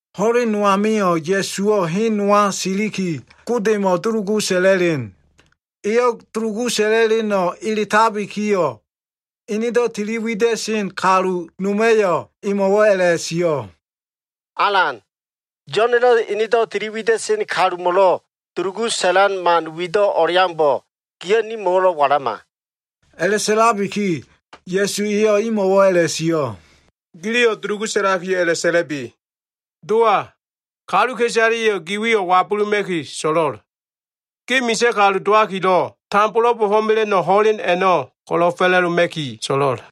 Ho꞉len no amio꞉ Ya꞉suwo꞉ hen nowa siliki, Godemo꞉ dulugu sa꞉la꞉len. Eyo꞉ dulugu sa꞉la꞉la꞉leno꞉ eletabikiyo꞉, enedo꞉ tiliwida꞉sen kalu noma꞉yo꞉ emo꞉wo꞉ a꞉la꞉sio꞉, “Alan, Yo꞉na꞉ enedo꞉ tili wida꞉sen kalumo꞉lo꞉ dulugu sa꞉lan man wido꞉ o꞉leaumbo꞉, giyo꞉ nimo꞉wo꞉lo꞉ walama.” A꞉la꞉sa꞉labiki Ya꞉su eyo꞉ imo꞉wo꞉ a꞉la꞉sio꞉, “Giliyo꞉ dulugu sa꞉lakiyo꞉ a꞉la꞉sa꞉la꞉bi. “ ‘Dowa, kaluka꞉isaleya꞉yo꞉ ge wiyo꞉ wabuluma꞉ki so꞉lo꞉l. Ge misa꞉ kalu dowakilo꞉, tambolo꞉ bo꞉fo꞉mela꞉no꞉ ho꞉len a꞉no꞉ ko꞉lo꞉ fa꞉la꞉doma꞉ki so꞉lo꞉l.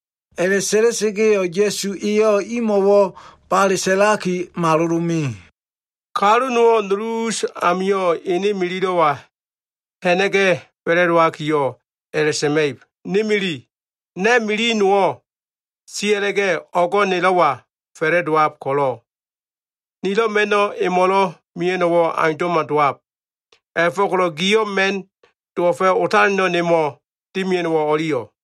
A꞉la꞉sa꞉la꞉sa꞉ga꞉yo꞉ Ya꞉su eyo꞉ imo꞉wo꞉ bale sa꞉laki malolo꞉ me. “Kalu nowo꞉ nulu us amio꞉ ene mililo꞉wa ha꞉na꞉ga꞉ fa꞉la꞉dowakiyo꞉ a꞉la꞉sa꞉ma꞉ib, ‘Ni mili, na꞉ mili nowo꞉ sia꞉la꞉ga꞉ o꞉go꞉ nelo꞉wa fa꞉la꞉dowab ko꞉lo꞉, nilo꞉ ma꞉no꞉ emo꞉lo꞉ mea꞉no꞉wo꞉ aundo꞉ma dowab. A꞉la꞉fo꞉ko꞉lo꞉ giyo꞉ ma꞉n dowo꞉fa꞉ otaleno꞉ nemo꞉ dimia꞉no꞉wo꞉ o꞉liyo꞉?’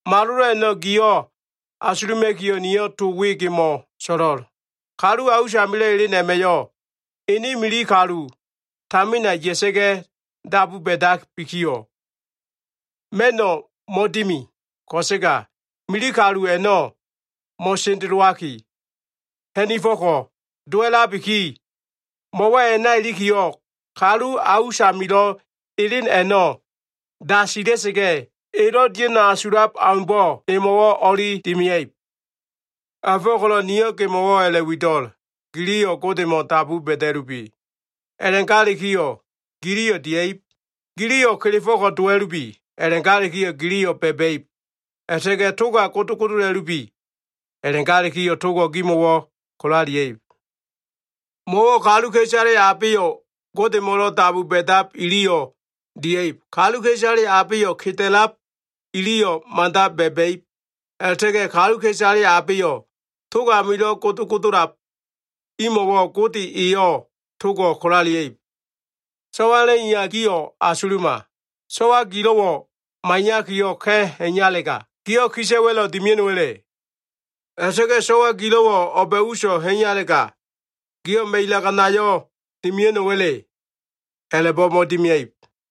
Malolo꞉ a꞉no꞉ gio꞉ asuluma꞉kiyo꞉, niyo꞉ to we gimo꞉ so꞉lo꞉l. Kalu a usamilo꞉ elen a꞉ma꞉yo꞉ ene mili kalu tamina ya꞉sa꞉ga꞉ dabu ba꞉dabikiyo꞉, ma꞉no꞉ mo꞉dimi. Ko꞉sega mili kalu a꞉no꞉ mo꞉sendelowaki, ha꞉nifo꞉ko꞉ dowa꞉labiki, mo꞉wo꞉ a꞉na ilikiyo꞉, kalu a usamilo꞉ elen a꞉no꞉ dasilia꞉ga꞉, elo꞉ dia꞉no꞉ asulab aumbo꞉ emo꞉wo꞉ o꞉li dimia꞉ib. “A꞉la꞉fo꞉ko꞉lo꞉ niyo꞉ gimo꞉wo꞉ a꞉la꞉wido꞉l. Giliyo꞉ Godemo꞉ dabu ba꞉da꞉lubi. A꞉la꞉galikiyo꞉ giliyo꞉ dia꞉ib. Giliyo꞉ kelefo꞉ko꞉ dowa꞉lubi. A꞉la꞉galikiyo꞉ giliyo꞉ ba꞉ba꞉ib. A꞉la꞉ta꞉ga꞉ toga godogodola꞉lubi. A꞉la꞉galikiyo꞉ togo꞉ gimo꞉wo꞉ kolalia꞉ib. Mo꞉wo꞉ kaluka꞉isale abeyo꞉ Godemo꞉lo꞉ dabu ba꞉dab iliyo꞉ dia꞉ib. Kaluka꞉isale abeyo꞉ keda꞉lab iliyo꞉ mada ba꞉ba꞉ib. A꞉la꞉ta꞉ga꞉ kaluka꞉isale abeyo꞉ tog amilo꞉ godogodolab imo꞉wo꞉ Gode eyo꞉ togo꞉ kolalia꞉ib. So꞉walo꞉ iya gio꞉ asuluma. So꞉wa gilo꞉wo꞉ maiyakiyo꞉ ka꞉ ha꞉iyalega, giyo꞉ kisa꞉wa꞉lo꞉ dimia꞉no꞉wa꞉le? A꞉la꞉ta꞉ga꞉ so꞉wa gilo꞉wo꞉ o꞉ba꞉ uso꞉ ha꞉iyalega, giyo꞉ ma꞉ilaganayo꞉ dimia꞉no꞉wa꞉le? A꞉la꞉bo꞉ mo꞉dimia꞉ib.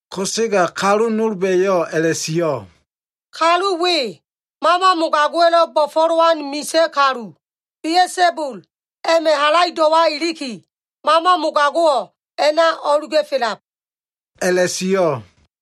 Ko꞉sega kaluka꞉isale nolba꞉yo꞉ a꞉la꞉sio꞉, “Kalu we, mama mogago꞉wa꞉lo꞉ bo꞉fo꞉lowan misa꞉ kalu, Bia꞉sabul a꞉ma꞉ halaido꞉wa iliki, mama mogago꞉wo꞉ a꞉na o꞉luga꞉felab” a꞉la꞉sio꞉.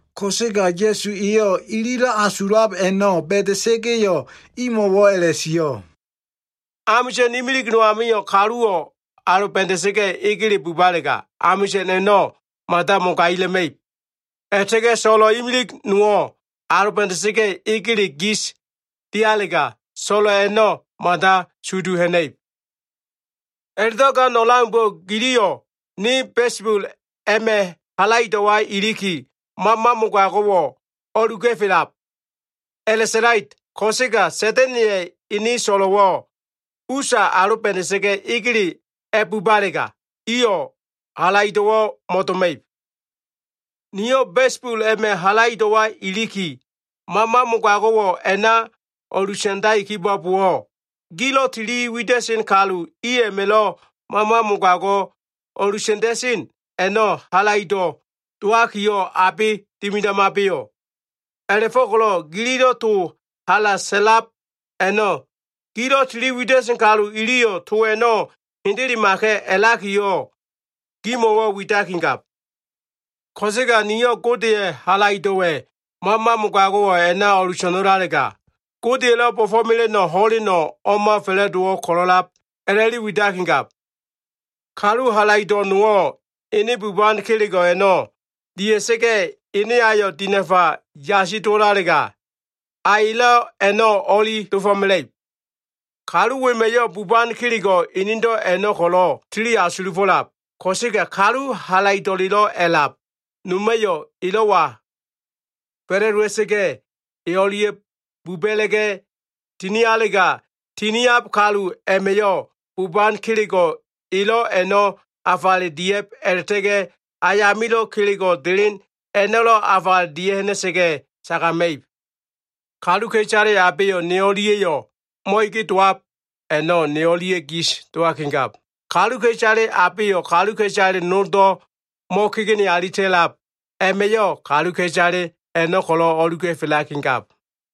Ko꞉sega Ya꞉su eyo꞉ ililo꞉ asulab a꞉no꞉ ba꞉da꞉sa꞉ga꞉yo꞉, imo꞉wo꞉ a꞉la꞉sio꞉, “Amisa꞉n imilig no amio꞉ kaluwo꞉ aloba꞉da꞉sa꞉ga꞉ egele bubalega, amisa꞉n a꞉no꞉ mada mogaila꞉ma꞉ib. A꞉la꞉ta꞉ga꞉ so꞉lo꞉ imilig nowo꞉ aloba꞉da꞉sa꞉ga꞉ egele gis dialega, so꞉lo꞉ a꞉no꞉ mada sudu ha꞉na꞉ib. A꞉la꞉do꞉ gan o꞉leaumbo꞉, giliyo꞉ ne Bia꞉sabul a꞉ma꞉ halaido꞉wa iliki, mama mogago꞉wo꞉ o꞉luga꞉felab a꞉la꞉sa꞉lait. Ko꞉sega Sa꞉da꞉na꞉ya꞉ ene so꞉lo꞉wo꞉ usa aloba꞉da꞉sa꞉ga꞉ egele a꞉bubalega, iyo꞉ halaido꞉wo꞉ mo꞉doma꞉ib. Niyo꞉ Bia꞉sabul a꞉ma꞉ halaido꞉wa iliki, mama mogago꞉wo꞉ a꞉na o꞉lusa꞉ndai kibo꞉bowo꞉, gilo꞉ tili wida꞉sen kalu i a꞉ma꞉lo꞉ mama mogago꞉ o꞉lusa꞉nda꞉sen a꞉no꞉, halaido꞉ dowakiyo꞉ abe dimidamabeyo꞉? A꞉la꞉fo꞉ko꞉lo꞉ gilo꞉ to hala sa꞉lab a꞉no꞉, gilo꞉ tiliwida꞉sen kalu iliyo꞉ to a꞉no꞉ hendelemaka꞉ a꞉lakiyo꞉, gimo꞉wo꞉ widakigab. Ko꞉sega niyo꞉ Godeya꞉ halaido꞉wa꞉ mama mogago꞉wo꞉ a꞉na o꞉luso꞉no꞉lalega, Godeya꞉lo꞉ bo꞉fo꞉mela꞉no꞉ ho꞉leno꞉ o꞉ma fa꞉la꞉dowo꞉ ko꞉lo꞉lab a꞉la꞉li widakigab. “Kalu halaido꞉ nowo꞉ ene buban kelego꞉ a꞉no꞉ dia꞉sa꞉ga꞉, ene ayo꞉ dinafa yasi dowo꞉lalega, a elo꞉ a꞉no꞉ o꞉li dofo꞉mela꞉ib. Kalu wema꞉yo꞉ buban kelego꞉ enedo꞉ a꞉no꞉ ko꞉lo꞉ tili asulufo꞉lab. Ko꞉sega kalu halaido꞉lelo꞉ a꞉lab noma꞉yo꞉ elo꞉wa fa꞉la꞉dowa꞉sa꞉ga꞉, e o꞉lia꞉ buba꞉la꞉ga꞉ tinialega, tiniab kalu a꞉ma꞉yo꞉ buban kelego꞉ elo꞉ a꞉no꞉ afale dia꞉b a꞉la꞉ta꞉ga꞉, ayamilo꞉ kelego꞉ delen a꞉no꞉lo꞉ afale dia꞉ha꞉na꞉sa꞉ga꞉ sagama꞉ib. Kaluka꞉isale abeyo꞉ ne o꞉lia꞉yo꞉ mo꞉ege dowab a꞉no꞉, ne o꞉lia꞉ gis dowakigab. Kaluka꞉isale abeyo꞉ kaluka꞉isale noldo꞉ mo꞉kegene alita꞉lab a꞉ma꞉yo꞉, kaluka꞉isale a꞉no꞉ ko꞉lo꞉ o꞉luga꞉felakigab.”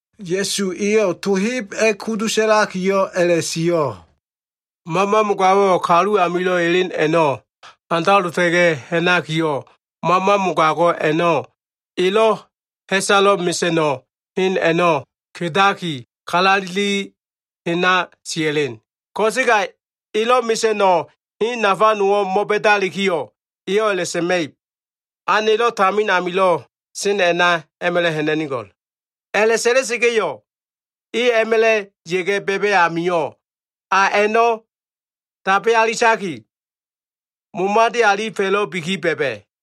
Ya꞉su eyo꞉ to heb a꞉kudu sa꞉lakiyo꞉ a꞉la꞉sio꞉, “Mama mogago꞉wo꞉ kalu amilo꞉ elen a꞉no꞉ handalota꞉ga꞉ ha꞉nakiyo꞉, mama mogago꞉ a꞉no꞉ elo꞉ ha꞉salo꞉ mesa꞉no꞉ hen a꞉no꞉ kedaki, kalaleli hena sia꞉len. Ko꞉sega elo꞉ mesa꞉no꞉ hen nafa nowo꞉ mo꞉ba꞉dalikiyo꞉, eyo꞉ a꞉la꞉sa꞉ma꞉ib, ‘A nelo꞉ tamin amilo꞉ sen a꞉na a꞉ma꞉la꞉ ha꞉na꞉nigo꞉l.’ A꞉la꞉sa꞉la꞉sa꞉ga꞉yo꞉ e a꞉ma꞉la꞉ ya꞉ga꞉ ba꞉ba꞉ amio꞉, a a꞉no꞉ tabe alitaki, momade alifo꞉labiki ba꞉ba꞉.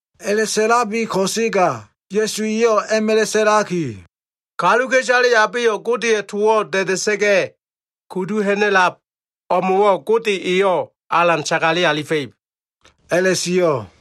A꞉la꞉sio꞉ ko꞉sega Ya꞉su eyo꞉ a꞉ma꞉la꞉ sa꞉laki, “Kaluka꞉isale abeyo꞉ Godeya꞉ towo꞉ da꞉da꞉sa꞉ga꞉ kudu ha꞉na꞉lab o꞉mo꞉wo꞉ Gode eyo꞉ alan sagale alifa꞉ib” a꞉la꞉sio꞉.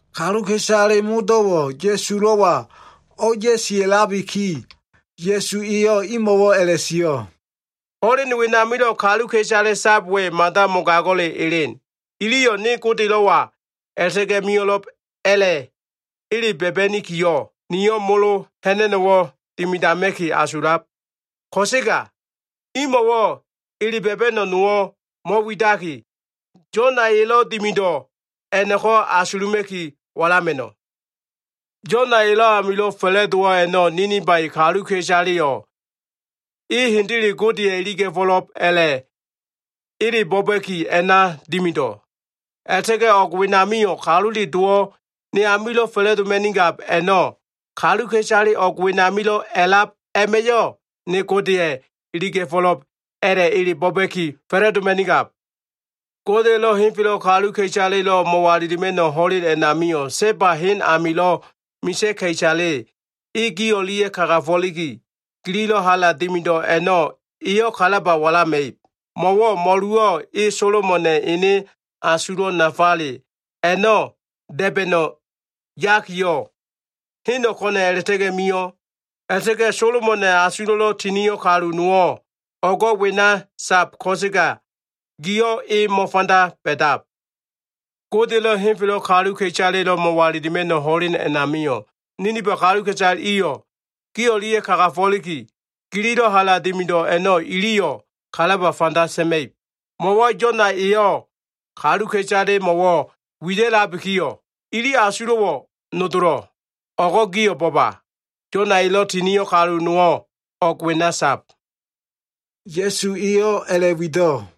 Kaluka꞉isale modo꞉wo꞉ Ya꞉sulo꞉wa o꞉ya꞉sia꞉labiki, Ya꞉su eyo꞉ imo꞉wo꞉ a꞉la꞉sio꞉, “Ho꞉len wenamilo꞉ kaluka꞉isale sab we mada mogago꞉le elen. Iliyo꞉ ne Godelo꞉wa a꞉la꞉ta꞉ga꞉ mio꞉lo꞉b a꞉la꞉ ele ba꞉ba꞉nikiyo꞉, niyo꞉ molo ha꞉na꞉no꞉wo꞉ dimidama꞉ki asulab. Ko꞉sega imo꞉wo꞉ ele ba꞉ba꞉no꞉ nowo꞉ mo꞉widaki, Yona elo꞉ dimido꞉ a꞉no꞉ko꞉ asuluma꞉ki walama꞉no꞉. Yona elo꞉ amio꞉ fa꞉la꞉dowo꞉ a꞉no꞉, Ninifa kaluka꞉isaleya꞉yo꞉ e hendele Godeya꞉ iliga꞉fo꞉lo꞉b a꞉la꞉ ele bo꞉ba꞉ki a꞉na dimido꞉. A꞉la꞉ta꞉ga꞉ o꞉g wenamio꞉, Kalule Dowo꞉ ne amilo꞉ fa꞉la꞉doma꞉nigab a꞉no꞉, kaluka꞉isale o꞉g wenamilo꞉ a꞉lab a꞉ma꞉yo꞉ ne Godeya꞉ iliga꞉fo꞉lo꞉b a꞉la꞉ ele bo꞉ba꞉ki fa꞉la꞉doma꞉nigab. Godeya꞉lo꞉ henfelo꞉ kaluka꞉isalelo꞉ mo꞉walilima꞉no꞉ ho꞉len a꞉namio꞉, Seba hen amilo꞉ misa꞉ ka꞉isale e gi o꞉lia꞉ kagafo꞉liki, gililo꞉ hala dimido꞉ a꞉no꞉ eyo꞉ kalaba walama꞉ib. Mo꞉wo꞉ mo꞉luwo꞉ e Solomona꞉ ene asulo꞉ nafale a꞉no꞉ da꞉ba꞉no꞉ yakiyo꞉, heno꞉ ko꞉na꞉ a꞉la꞉ta꞉ga꞉ mio꞉. A꞉la꞉ta꞉ga꞉ Solomona꞉ asulo꞉lo꞉ tinio꞉ kalu nowo꞉ o꞉go꞉ wena sab ko꞉sega gio꞉ e mo꞉fanda ba꞉dab. Godeya꞉lo꞉ henfelo꞉ kaluka꞉isale mo꞉walilima꞉no꞉ ho꞉len a꞉namio꞉, Ninifa kalu iyo꞉ gi o꞉lia꞉ kagafo꞉liki, gililo꞉ hala dimido꞉ a꞉no꞉ iliyo꞉ kalaba fanda sa꞉ma꞉ib. Mo꞉wo꞉ Yona eyo꞉ kaluka꞉isalemo꞉wo꞉ wida꞉labikiyo꞉, ili asulo꞉wo꞉ nodolo꞉. O꞉go꞉ gio꞉ bo꞉ba! Yona elo꞉ tinio꞉ kalu nowo꞉ o꞉go꞉ wena sab.” Ya꞉su eyo꞉ a꞉la꞉wido꞉.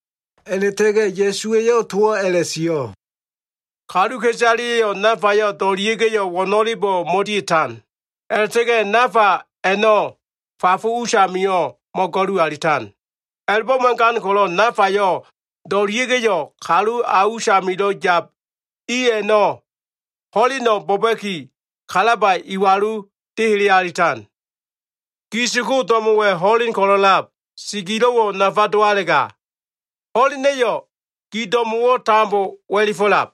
A꞉la꞉ta꞉ga꞉ Ya꞉su eyo꞉ towo꞉ a꞉la꞉sio꞉, “Kaluka꞉isaleya꞉yo꞉ nafayo꞉ do꞉lia꞉ga꞉yo꞉ wo꞉no꞉lebo꞉ mo꞉dia꞉tan. A꞉la꞉ta꞉ga꞉ nafa a꞉no꞉ fafo usamio꞉ mo꞉go꞉lu alitan. A꞉la꞉bo꞉ mo꞉gan ko꞉lo꞉ nafayo꞉ do꞉lia꞉ga꞉yo꞉, kalu a usamilo꞉ yab i a꞉no꞉ ho꞉leno꞉ bo꞉ba꞉ki, kalaba iwalu dehele alitan. Gi siko, do꞉mo꞉wa꞉ ho꞉len ko꞉lo꞉lab. Si gilo꞉wo꞉ nafa dowalega, ho꞉lena꞉yo꞉ gi do꞉mo꞉wo꞉ tambo wa꞉lifo꞉lab.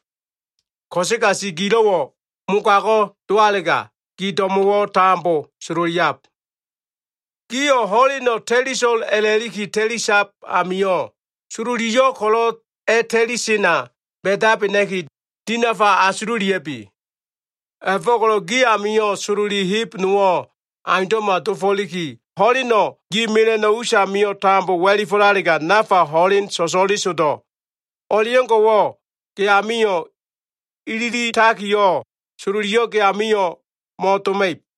Ko꞉sega si gilo꞉wo꞉ mogago꞉ dowalega, ge do꞉mo꞉wo꞉ tambo sololiab. Giyo꞉ ho꞉len ta꞉liso꞉l a꞉la꞉liki, ta꞉lisab amio꞉ sololiyo꞉ ko꞉lo꞉ a꞉ta꞉lisena ba꞉dabena꞉ki, dinafa asululia꞉bi. A꞉la꞉fo꞉ko꞉lo꞉ gi amio꞉ sololi heb nowo꞉ aundo꞉ma dofo꞉liki, ho꞉leno꞉ gi mela꞉no꞉ usamio꞉ tambo wa꞉lifo꞉lalega, nafa ho꞉len so꞉so꞉lesodo꞉ o꞉leo꞉ngo꞉wo꞉, ge amio꞉ ililitakiyo꞉, sololiyo꞉ ge amio꞉ mo꞉doma꞉ib.”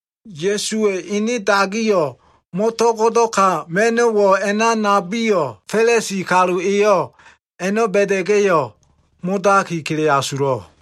Ya꞉suwa꞉ ene dagiyo꞉ mo꞉to꞉go꞉do꞉ka ma꞉no꞉wo꞉ a꞉na nabiyo꞉, Fa꞉lisi kalu eyo꞉ a꞉no꞉ ba꞉da꞉ga꞉yo꞉ modaki kele asulo꞉.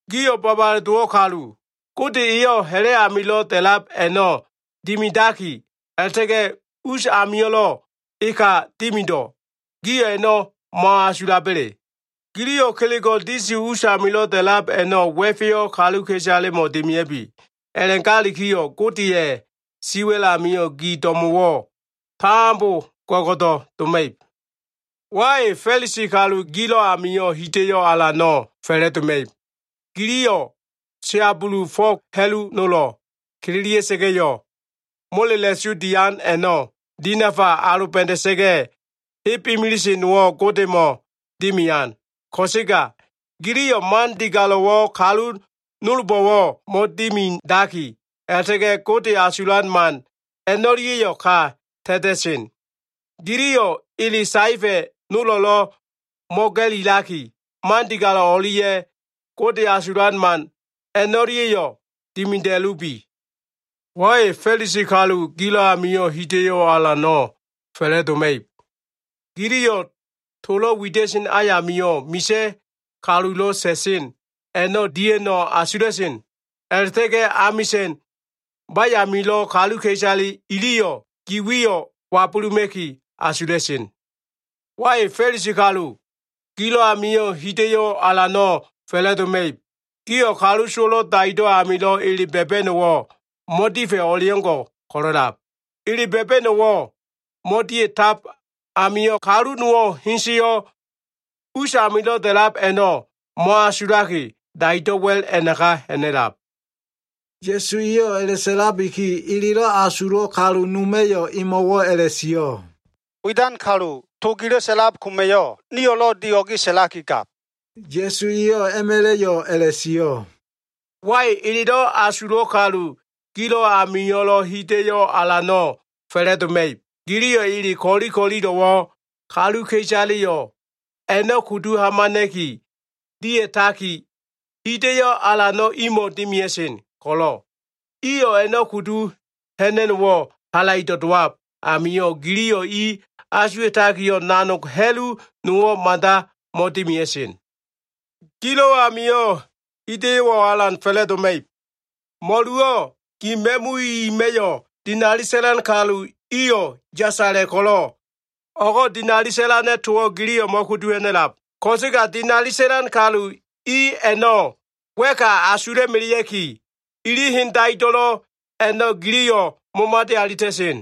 Gio꞉ babale dowo꞉ kalu! Gode eyo꞉ ha꞉la꞉ amilo꞉ da꞉lab a꞉no꞉ dimidaki, a꞉la꞉ta꞉ga꞉ us amio꞉lo꞉ eka dimido꞉. Gio꞉ a꞉no꞉ mo꞉asulaba꞉le? Giliyo꞉ kelego꞉ disi usamilo꞉ da꞉lab a꞉no꞉ wa꞉feyo꞉ kaluka꞉isalemo꞉ dimia꞉bi. A꞉la꞉galikiyo꞉ Godeya꞉ siwa꞉l amio꞉ gi do꞉mo꞉wo꞉ tambo go꞉go꞉do꞉ doma꞉ib. “Wai! Fa꞉lisi kalu gilo꞉ amio꞉ hida꞉yo꞉ alano꞉ fa꞉la꞉doma꞉ib. Giliyo꞉ siabulu fo꞉g ha꞉lu nolo꞉ kililia꞉sa꞉ga꞉yo꞉, molela꞉su diab a꞉no꞉ dinafa aloba꞉da꞉sa꞉ga꞉, heb imilise nowo꞉ Godemo꞉ dimian. Ko꞉sega giliyo꞉ man digalo꞉wo꞉ kalu nolbo꞉wo꞉ mo꞉dimidaki, a꞉la꞉ta꞉ga꞉ Gode asulan man a꞉no꞉lia꞉yo꞉ ka ta꞉ta꞉sen. Giliyo꞉ ele saefa꞉ nolo꞉lo꞉ mo꞉ga꞉lilaki, man digalo꞉ o꞉lia꞉ Gode asulan man a꞉no꞉lia꞉yo꞉ dimida꞉lubi. “Wai! Fa꞉lisi kalu gilo꞉ amio꞉ hida꞉yo꞉ alano꞉ fa꞉la꞉doma꞉ib. Giliyo꞉ tolo꞉ wida꞉sen ayamio꞉ misa꞉ kalulo꞉ sa꞉sen a꞉no꞉ dia꞉no꞉ asula꞉sen. A꞉la꞉ta꞉ga꞉ amisa꞉n bayamio꞉lo꞉ kaluka꞉isale iliyo꞉ gi wiyo꞉ wabuluma꞉ki asula꞉sen. “Wai! Fa꞉lisi kalu, gilo꞉ amio꞉ hida꞉yo꞉ alano꞉ fa꞉la꞉doma꞉ib. Gio꞉ kalu sowo꞉lo꞉ daido꞉ amilo꞉ ele ba꞉ba꞉no꞉wo꞉ mo꞉difa꞉ o꞉leo꞉ngo꞉ ko꞉lo꞉lab. Ele ba꞉ba꞉no꞉wo꞉ mo꞉dia꞉tab amio꞉, kalu nowo꞉ heseyo꞉ us amilo꞉ da꞉lab a꞉no꞉ mo꞉asulaki, daido꞉ wa꞉l a꞉naka ha꞉na꞉lab.” Ya꞉su eyo꞉ a꞉la꞉sa꞉labiki, elelo꞉ asulo꞉ kalu noma꞉yo꞉ emo꞉wo꞉ a꞉la꞉sio꞉, “Widan kalu, to gilo꞉ sa꞉lab koma꞉yo꞉, nio꞉lo꞉ dio꞉ge sa꞉lakigab.” Ya꞉su eyo꞉ a꞉ma꞉la꞉yo꞉ a꞉la꞉sio꞉, “Wai! Elelo꞉ asulo꞉ kalu gilo꞉ amio꞉lo꞉ hida꞉yo꞉ alano꞉ fa꞉la꞉doma꞉ib. Giliyo꞉ ele ko꞉li ko꞉lilo꞉wo꞉ kaluka꞉isaleyo꞉ a꞉no꞉ kudu hamana꞉ki dia꞉taki, hida꞉yo꞉ alano꞉ imo꞉ dimia꞉sen ko꞉lo꞉, iyo꞉ a꞉no꞉ kudu ha꞉na꞉no꞉wo꞉ halaido꞉ dowab amio꞉, giliyo꞉ i asuwa꞉takiyo꞉ nanog ha꞉lu nowo꞉ mada mo꞉dimida꞉sen. Gilo꞉ amio꞉ hida꞉yo꞉ alano꞉ fa꞉la꞉doma꞉ib! Mo꞉luwo꞉ gi ma꞉mu ima꞉yo꞉ dinali sa꞉lan kalu iyo꞉ yasala꞉ ko꞉lo꞉, o꞉go꞉ dinali sa꞉lana꞉ towo꞉ giliyo꞉ mo꞉kudu ha꞉na꞉lab ko꞉sega dinali sa꞉lan kalu i a꞉no꞉ wa꞉ka asula꞉melea꞉ki, ili hen daido꞉lo꞉ a꞉no꞉ giliyo꞉ momade alita꞉sen.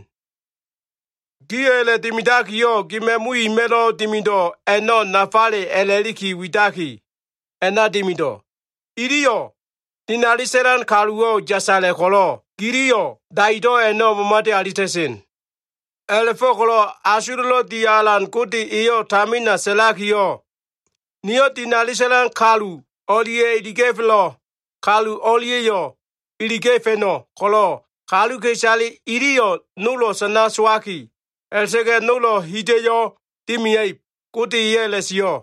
Gio꞉ a꞉la꞉dimidakiyo꞉, gi ma꞉mu ima꞉lo꞉ dimido꞉ a꞉no꞉ nafale a꞉la꞉li widaki, a꞉na dimido꞉. Iliyo꞉ dinali sa꞉lan kaluwo꞉ yasala꞉ ko꞉lo꞉, giliyo꞉ daido꞉ a꞉no꞉ momade alita꞉sen. A꞉la꞉fo꞉ko꞉lo꞉ asulo꞉lo꞉ di alan Gode eyo꞉ tamina sa꞉lakiyo꞉, ‘Niyo꞉ dinali sa꞉lan kalu o꞉lia꞉ iliga꞉felo꞉ kalu o꞉lia꞉yo꞉ iliga꞉fa꞉no꞉ ko꞉lo꞉, kaluka꞉isale iliyo꞉ nolo꞉ sana sowaki, a꞉la꞉ta꞉ga꞉ nolo꞉ hida꞉yo꞉ dimia꞉ib.’ Gode eyo꞉ a꞉la꞉sio꞉.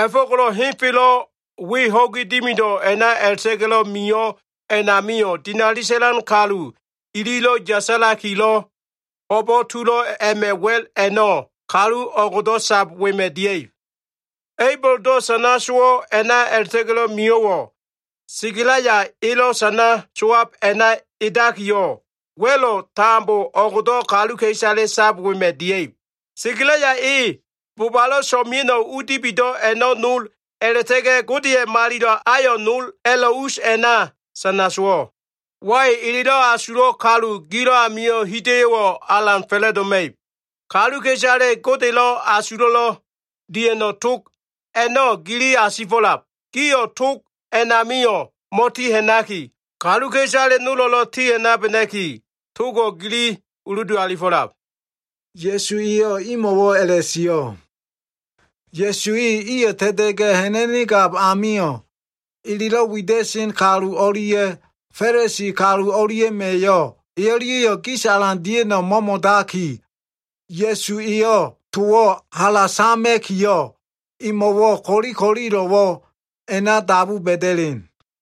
A꞉la꞉fo꞉ko꞉lo꞉ henfelo꞉ we ho꞉gi dimido꞉ a꞉na a꞉la꞉ta꞉ga꞉lo꞉ mio꞉ a꞉namio꞉, dinali sa꞉lan kalu ililo꞉ yasala꞉likilo꞉ ho꞉bo꞉ tulo꞉ a꞉ma꞉ wa꞉l a꞉no꞉, kalu o꞉gdo꞉ sab wema꞉ dia꞉ib. A꞉iboldo꞉ sana sowo꞉ a꞉na a꞉la꞉ta꞉ga꞉lo꞉ mio꞉wo꞉, Sekalaya elo꞉ sana sowab a꞉na edakiyo꞉ wa꞉lo꞉ tambo o꞉gdo꞉ kaluka꞉isale sab wema꞉ dia꞉ib. Sekalaya e bobalo꞉ so꞉mea꞉no꞉ u dibido꞉ a꞉no꞉ nol a꞉la꞉ta꞉ga꞉ Godeya꞉ malilo꞉ ayo꞉ nol a꞉lo꞉ us a꞉na sana sowo꞉. “Wai! Elelo꞉ asulo꞉ kalu gilo꞉ amio꞉ hida꞉yo꞉wo꞉ alan fa꞉la꞉doma꞉ib. Kaluka꞉isale Godelo꞉ asulo꞉lo꞉ dia꞉no꞉ tog a꞉no꞉ gili asifo꞉lab. Gio꞉ tog a꞉namio꞉ mo꞉ti ha꞉naki, kaluka꞉isale nolo꞉lo꞉ ti ha꞉nabena꞉ki, togo꞉ gili uludu alifo꞉lab.” Ya꞉su eyo꞉ imo꞉wo꞉ a꞉la꞉sio꞉. Ya꞉su e iyo꞉ ta꞉ta꞉ga꞉ ha꞉na꞉nigab amio꞉, elelo꞉ wida꞉sen kalu o꞉lia꞉ Fa꞉lisi kalu o꞉lia꞉ma꞉yo꞉ e o꞉lia꞉yo꞉ gis alan dia꞉no꞉ mo꞉mo꞉daki, Ya꞉su eyo꞉ towo꞉ hala sama꞉kiyo꞉, emo꞉wo꞉ ko꞉li ko꞉lilo꞉wo꞉ a꞉na dabu ba꞉da꞉len.